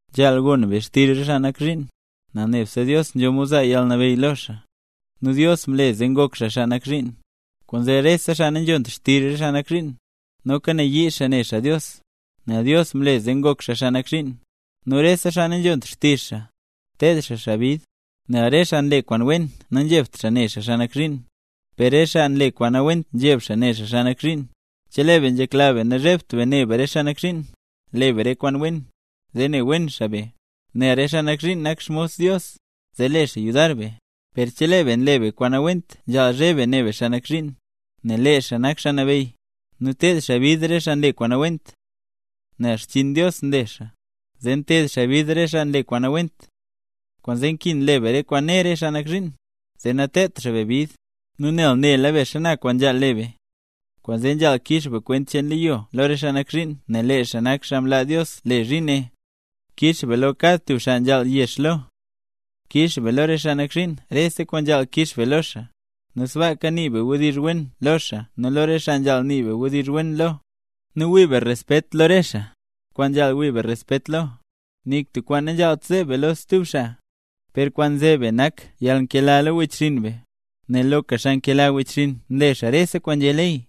Nzhaal gon be xtizh re xaa nak zhiin, nel nebse Dios nzho mod zaa yalnabeyy lo xaa, nu Dios mle zee ngok xaa xaa nak zhiin. Kwaanzee rese xaa nanzhont xtizh re xaa nak zhiin, noka nayii xaa ne xaa Dios, nel Dios mle zee ngok xaa xaa nak zhiin. Nu rese xaa nanzhont xtizh xaa, ted xaa xaa bid. Nel re xaa nle kwaan wen nanzhebt xaa ne xaa xaa nak zhiin, per re xaa nle kwaan nawent nzheb xaa ne xaa xaa nak zhiin. Chelee be nzhekla be nazhebt be ne be re xaa nak zhiin, le be re kwaan wen, zee ne wen xaa be, nel re xaa nak zhiin nak xmos Dios, zee le xaa yudar be. Per chelee be nle be kwaan nawent nzhaal zheb be ne be xaa nak zhiin, nel lee xaa nak xaa nabeyy, nu nted xaa bid re xaa nle kwaan nawent. Nel xchiin Dios nle xaa, zee nteed xaa bid re xaa kwaan nle kwaan nawent. Kwaanzee nkin le be kwaan né re xaa nak zhiin, zee nateedt xaa be bid, nu nel nela be xana kwaan nzhaal le be. Kwaanzee nzhaal kix be kwent cheen leyo lo re xaa nak zhiin nel lee xaa nak xaa mlaa Dios le zhiin ne. Kix be lo kad tub xaa kwaan nzhaal yex lo. Kix be lo re xaa nak zhiin rese kwaan nzhaal kix be lo xaa; nu sbaaka nii be wdizh wen lo xaa nu lo re xaa nzhaal nii be wdizh wen lo; nu wii be respet lo re xaa, kwaan nzhaal wii be respet lo. Nik tub kwaan nanzhaalt zeb be lo stub xaa. Per kwaan nzeb be nak yalnkela lo wechxinn be, nel loka xaa nkela wechxinn nle xaa rese kwaan nzhé ley.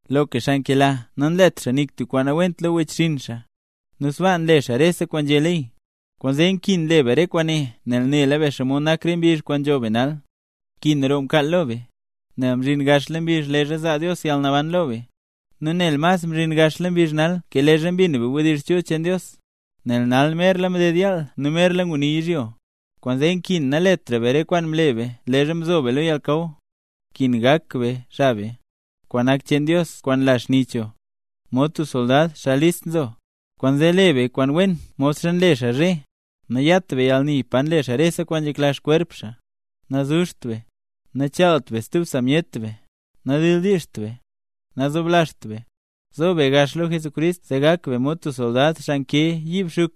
Loka xaa nkela nanlet xaa nik tub kwaan nawent lo wechxinn xaa, nu sbaa nle xaa rese kwaan nzhé ley. Kwaanzee nkin le be re kwaane nel nela be xomod nak re mbizh nzho be nal; nkin roo mkaal lo be, nel mzhin gaxla mbizh leezha zaa Dios yalnaban lo be; nu nel mas mzhin gaxla mbizh nal ke leezha mbin be wdizh chul cheen Dios. Nel nal merla mded yaal nu merla nguni yizhyo; kwaanzee nkin naletra be re kwaan mle be leezha mzo be lo yalnakaw; nkin gak be xab be, kwaan nak cheen Dios kwaan nla xni cho, mod tub soldad, xaa list nzo. Kwaanzee le be kwaan wen modxa nle xaa zhe: nayat be yalni pa nle xaa rese kwaan nzhekla xkwerp xaa, nazuzht be, nachaalt be stub sa myet be, nadildiizht be, nazoblazht be. Zo be gax lo Jesucrist zee gak be mod tub soldad xaa nkee yiib xuk,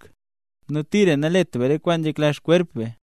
nu tira nalet be re kwaan nzhekla kwerp cheen be.